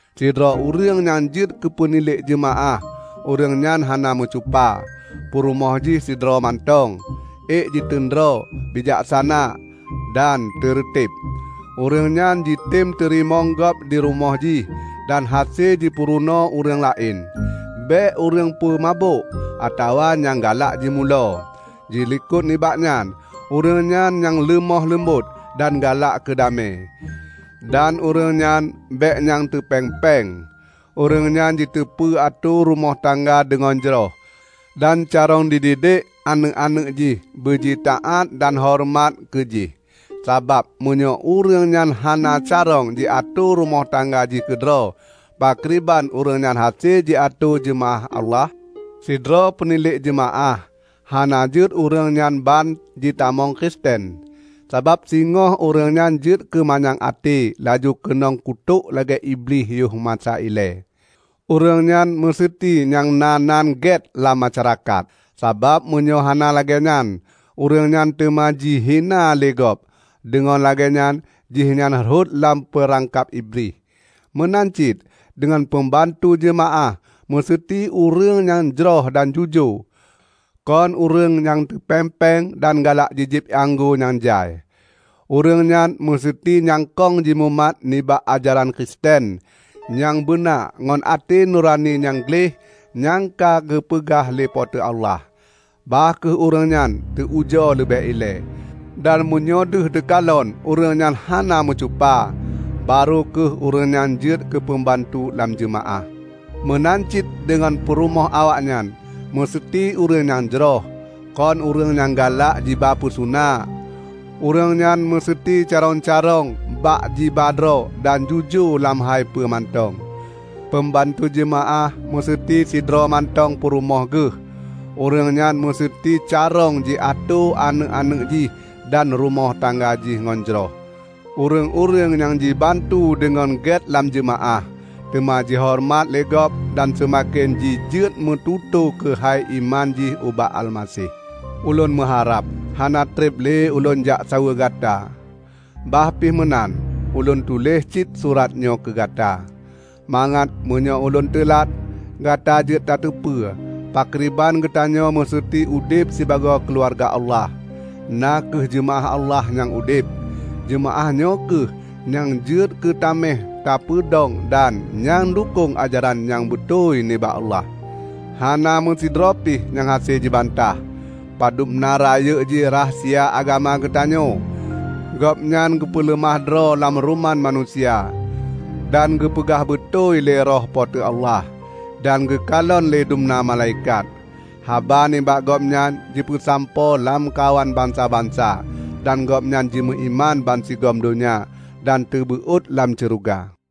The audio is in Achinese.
Sidroe ureuëng nyang jeuet keupeunilék jeumaáh ureuëng nyan hana meucupa, peurumoh jih sidroe mantong, ék jiteun droe, bijaksana, dan teureuteb; ureuëng nyan jitem teurimong gob dirumoh jih, dan hase jipeurunoe ureuëng laén; bék ureuëng peumabök, atawa nyang galak jimulo. Dilikot nibak nyan, ureuëng nyan nyang leumoh leumbot dan galak keudamé. Dan ureuëng nyan bék nyang teupéng-péng. Ureuëng nyan jiteupeu atoe rumoh tangga deungon jroh, dan carông jididek aneuëk-aneuëk jih beujitaát dan horeumat keu jih. Sabab meunyoe ureuëng nyan hana carông jiatoe rumoh tangga jih keudroe, pakriban ureuëng nyan hase jiatoe jeumaáh Allah? Sidroe peunilék jeumaáh hana jeuet ureuëng nyan ban jitamong Kristen, sabab singoh ureuëng nyan jeuet keu manyang até laju keunong kutok lagée Iblih yoh masa ilée. Ureuëng nyan meuseuti nyang na nan gét lam masyarakat; sabab meunyoe hán lagée nyan, ureuëng nyan teuma jihina lé gob, deungon lagée nyan jihnyan rhot lam peurangkab Iblih. Meunan cit deungon peumbantu jeumaáh meuseuti ureuëng nyang jroh dan jujoe; kon ureuëng nyang teupéng-péng dan galak jijieb ié anggô nyang jai. Ureuëng nyan meuseuti nyang kong jimumat nibak ajaran Kristen nyang beuna ngon até nurani nyang gleh nyang ka geupeugah lé Po teu Allah. Bah kheueh ureuëng nyan teu ujoe leubeh ilée, dan meunyoe deuh teukalon ureuëng nyan hana meucupa, barô kheueh ureuëng nyan jeuet keupeubantu lam jeumaáh. Meunan cit deungon peurumoh awaknyan museuti ureuëng nyang jroh, kon ureuëng nyang galak jiba peusuna. Ureuëng nyan meuseuti carông-carông bak jiba droe dan jujoe lam hai peue mantong. Peumbantu jeumaáh museuti sidroe mantong peurumoh geuh. Ureuëng nyan museuti carông jiatoe aneuëk-aneuëk jih dan rumoh tangga jih ngon jroh. Ureuëng-ureuëng nyang jibantu deungon gét lam jeumaáh, teuma jihoreumat lé gob dan seumaken jijeuet meututoe keuhai iman jih ubak Almaseh. Ulôn meuharab hana treb lé ulôn jak saweue gata. Bah pih meunan, ulôn tuléh cit surat nyoe keugata, mangat meunyoe ulôn teulat, gata jeuet tateupeue pakriban geutanyoe meuseuti udeb sibagoe keuluwarga Allah, na kheueh jeumaáh Allah nyang udeb. Jeumaáh nyoe kheueh nyang jeuet keu taméh teupeudong dan nyang dukong ajaran nyang beutôi nibak Allah. Hana meusidroe pi nyang hase jibantah, padubna rayeuk jih rahsia agama geutanyoe: Gobnyan geupeuleumah droe lam ruman manusia, dan geupeugah beutôi lé Roh Pe teu Allah, dan geukalon lé dumna malaikat. Haba nibak Gobnyan jipeusampoe lamkawan bansa-bansa, dan Gobnyan jimeuiman bansigom donya dan teubeuot lam syeuruga.